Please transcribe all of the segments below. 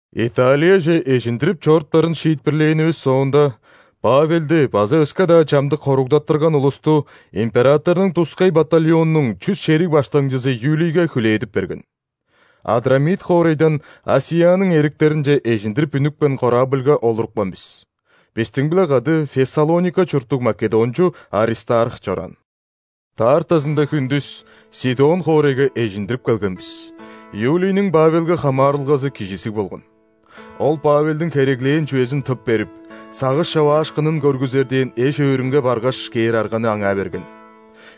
Италияже эжиндирип чоруптарын шиитпирлээнивис соонда, Павелди база өске-даа чамдык хоругдаттырган улусту императорнуң тускай батальоннуң чүс шериг баштыңчызы Юлийге хүлээдип берген. Адрамит хоорайдан ·Асияның эриктеринче эжиндирип үнүпкен корабльга олурупкан бис. Бистиң-биле кады Фессалоника чурттуг македончу Аристарх чораан. Даартазында хүндүс Сидон хоорайга эжиндирип келген бис. Юлийниң Павелге хамаарылгазы кижизиг болган. Ол Павелдиң хереглээн чүвезин тып берип, сагыш човаашкынын көргүзер дээн эш-өөрүнге баргаш кээр арганы аңаа берген.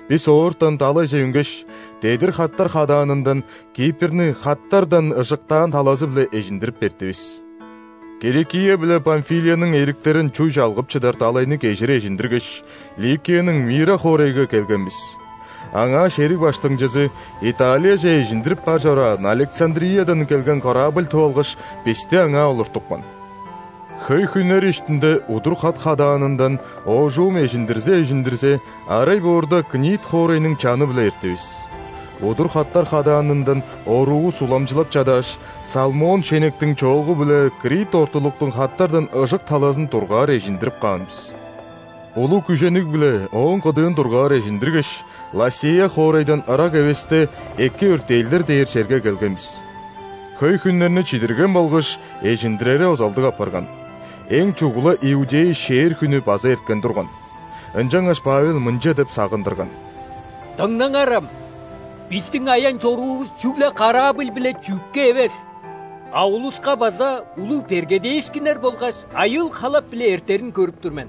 Бис оортан далайже үнгеш, дедир хаттар хадаанындан Кипрни хаттардан ыжыктаан талазы-биле эжиндирип эрттивис. Киликия биле Памфилияның эриктерин чуй чалгып чыдар далайны кежир эжиндиргеш, Ликияның Мира хоорайга келген бис. Аңаа шериг баштыңчызы Италияже эжиндирип бар чораан Александриядан келген корабль тып алгаш, бисти аңаа олуртупкан. Хөй хүннер иштинде удур хат хадаанындан оожум эжиндирзе-эжиндирзе, арай боорда Книд хоорайның чаны-биле эрттивис. Удур хаттар хадаанындан оруувус уламчылап чадааш, Салмон шенектиң чоогу-биле Крит ортулуктуң хаттардан ыжык талазын дургаар эжиндирип каан бис. Улуг күжениг-биле ооң кыдыын дургаар эжиндиргеш, Ласея хоорайдан ырак эвесте Эки Өртээлдер дээр черге келген бис. Хөй хүннерни чидирген болгаш, эжиндирери озалдыг апарган, эң чугула иудей ·шээр хүнү база эрткен турган. Ынчангаш Павел мынча деп сагындырган: «Дыңнаңарам! Бистиң аян-чоруувус чүгле корабль биле чүъкке эвес, а улуска база улуг бергедээшкиннер болгаш айыыл-халап-биле эртерин көрүп тур мен».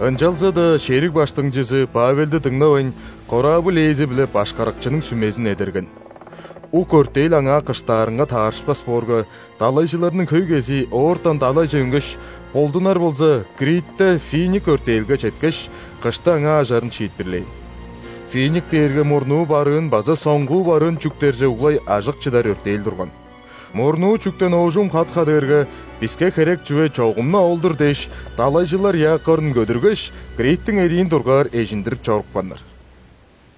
Ынчалза-даа шериг баштыңчызы Павелди дыңнавайн, корабль ээзи биле башкарыкчының сүмезин эдерген. Ук өртээл аңаа кыштаарынга таарышпас боорга, далайжыларның хөй кезии оортан далайже үнгеш, болдунар болза, Критте Финик өртээлге четкеш, кышты аңаа ажарын шиитпирлээн. Финик дээрге мурнуу-барыын база соңгу-барыын чүктерже углай ажык чыдар өртээл турган. Мурнуу чүктен оожум хат хадыырга, «Биске херек чүве чогум-на ол-дур» дээш, далайжылар якорун көдүргеш, Криттиң эриин дургаар эжиндирип чорупканнар.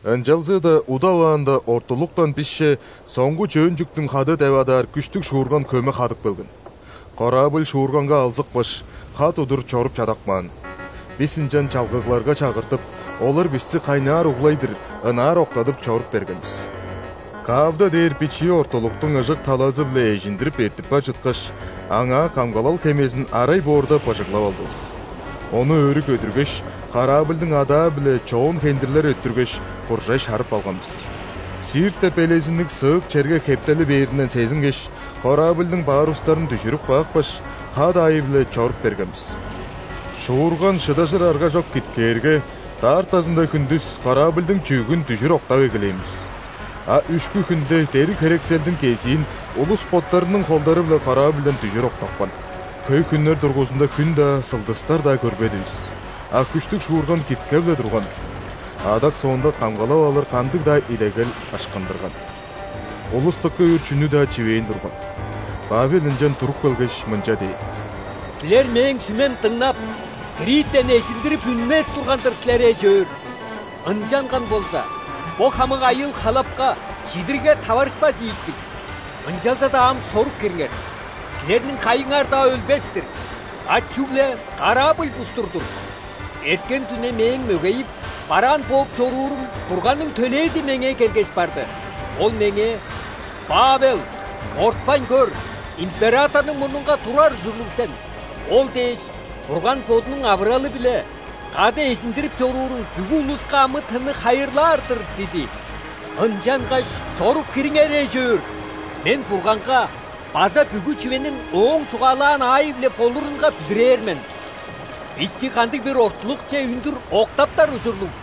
Ынчалза-даа удаваанда ортулуктан бисче «соңгу-чөөн чүктүң хады» деп адаар күштүг шуурган хөме хадып келген. Корабль шуурганга алзыпкаш, хат удур чоруп чадап каан. Бис ынчан чалгыгларга чагыртып, олар бисти кайнаар углай-дыр, ынаар октадып чоруп берген бис. Кавда дээр бичии ортулуктуң ыжык талазы-биле эжиндирип эртип бар чыткаш, аңаа камгалал хемезин арай боорда быжыглап алдывыс. Ону өрү көдүргеш, корабльдың адаа-биле чоон хендирлер өттүргеш, куржай шарып алган бис. Сирт деп элезинниг сыык черге хептели бээринден сезингеш, корабльдың парустарын дүжүрүп каапкаш, хат аайы-биле чоруп берген бис. Шуурган шыдажыр аргажок киткээрге, даартазында хүндүс корабльдың чүъгүн дүжүр октап эгелээн бис. А үшкү хүнде дериг-херекселдиң кезиин улус боттарының холдары-биле корабльдан дүжүр октапкан. Хөй хүннер дургузунда хүн-даа, сылдыстар-даа көрбедивис, а күштүг шуурган киткеп-ле турган. Адак соонда камгалал алыр кандыг-даа идегел ышкындырган. Улус дыка үр чүнү-даа чивээн турган. Павел ынчан туруп келгеш, мынча дээн: «Силер мээң сүмем дыңнап, Криттен эжиндирип үнмес турган-дыр силер, эш-өөр. Ынчанган болза, бо хамык айыыл-халапка, чидиригге таварышпас ийик бис. Ынчалза-даа ам сорук кириңер: силерниң кайыңар-даа өлбес-тир, а чүгле корабль бустур-дур. Эрткен дүне мээң мөгейип, бараан бооп чоруурум Бурганның төлээзи меңээ келгеш барды. Ол меңээ: „Павел, кортпайн көр. Императорнуң мурнунга турар ужурлуг сен, ол дээш, Бурган Бодунуң авыралы-биле кады эжиндирип чорууруң бүгү улуска амы-тынны хайырлаар-дыр“ – диди. Ынчангаш сорук кириңер, эш-өөр. Мен Бурганга база бүгү чүвениң Ооң чугаалаан аайы-биле болурунга бүзүрээр мен. Бисти кандыг-бир ортулукче үндүр октаптар ужурлуг».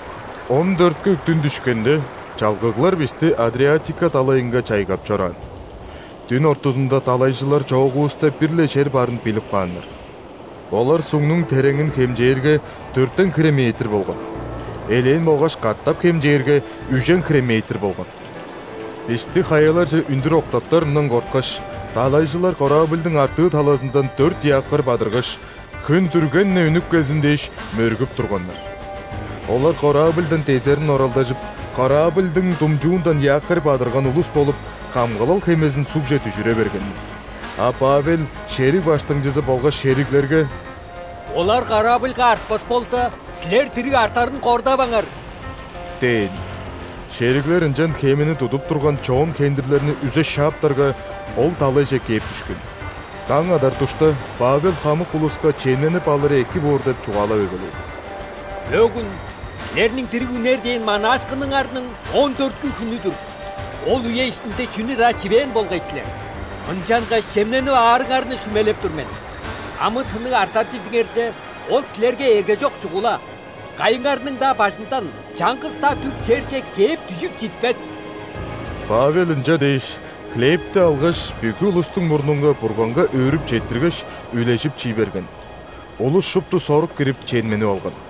Он дөрткү дүн дүшкенде, чалгыглар бисти Адриатика далайынга чайгап чораан. Дүн ортузунда далайжылар чоогувуста бир-ле чер барын билип кааннар. Олар сугнуң тереңин хемчээрге, дөртен хире метр болган. Элээн болгаш, катап хемчээрге, үжен хире метр болган. Бисти хаяларже үндүр октаптарындан корткаш, далайжылар корабльдың артыы талазындан дөрт якорь бадыргаш, хүн дүрген-не үнүп келзин дээш, мөргүп турганнар. Олар корабльдан дезерин оралдажып, корабльдың думчуундан якорь бадырган улус болуп, камгалал хемезин сугже дүжүре бергеннер. А Павел шериг баштыңчызы болгаш шериглерге: «Олар корабльга артпас болза, силер дириг артарын кордаваңар» – дээн. Шериглер ынчан хемени тудуп турган чоон хендирлерни үзе шааптарга, ол далайже кээп дүшкен. Даң адар душта Павел хамык улуска чемненип алыры эки боор деп чугаалап эгелээн: «Бөгүн силерниң дириг үнер дээн манаашкыныңарның он дөрткү хүнү-дүр. Ол үе иштинде чүнү-даа чивээн болгай силер. Ынчангаш чемненип аарыңарны сүмелеп тур мен. Амы-тынныг артар дизиңерзе, ол силерге эргежок чугула, кайыңарның-даа бажындан чаңгыс-даа дүк черже кээп дүжүп читпес». Павел ынча дээш, хлебти алгаш, бүгү улустуң мурнунга Бурганга өөрүп четтиргеш, үлежип, чий берген. Улус шупту сорук кирип, чемненип алган.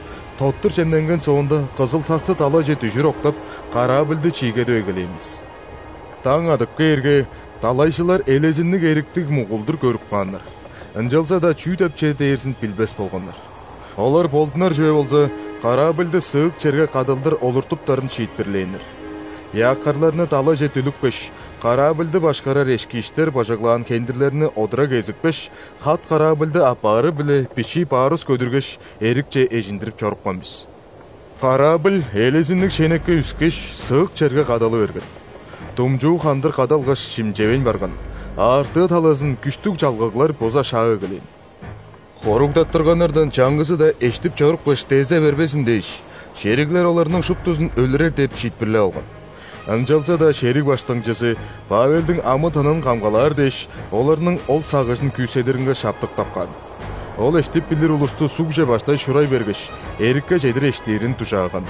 Тоттур чемненген соонда, кызыл-тасты далайже дүжүр октап, корабльды чиигедип эгелээн бис. Даң адып кээрге, далайжылар элезинниг эриктиг мугулдур көрүп кааннар, ынчалза-даа чүү деп чер дээрзин билбес болганнар. Олар, болдунар чүве болза, корабльды сыык черге кадалдыр олуртуптарын шиитпирлээннер. Якорьларны далайже дүлүпкеш, корабльды башкарар эшкииштер быжыглаан хендирлерни одура кезипкеш, хат корабльды аппаары-биле бичии парус көдүргеш, эрикче эжиндирип чорупкан бис. Корабль элезинниг шенекке үскеш, сыык черге кадалы берген. Думчуу хандыр кадалгаш, шимчевейн барган, а артыы талазын күштүг чалгыглар буза шаап эгелээн. Хоругдаттырганнардан чаңгызы-даа эштип чорупкаш, дезе бербезин дээш, шериглер оларның шуптузун өлүрер деп шиитпирлеп алган. Ынчалза-даа шериг баштыңчызы Павелдиң амы-тынын камгалаар дээш, оларның ол сагыжын күүседиринге шаптыктап каан. Ол эштип билир улусту сугже баштай шурай бергеш, эрикке чедир эштирин дужааган.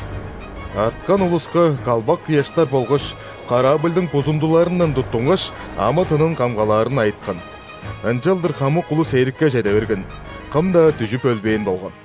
Арткан улуска калбак ыяштар болгаш корабльдың бузундуларындан туттунгаш, амы-тынын камгалаарын айыткан. Ынчалдыр хамык улус эрикке чеде берген, кым-даа дүжүп өлбээн болган.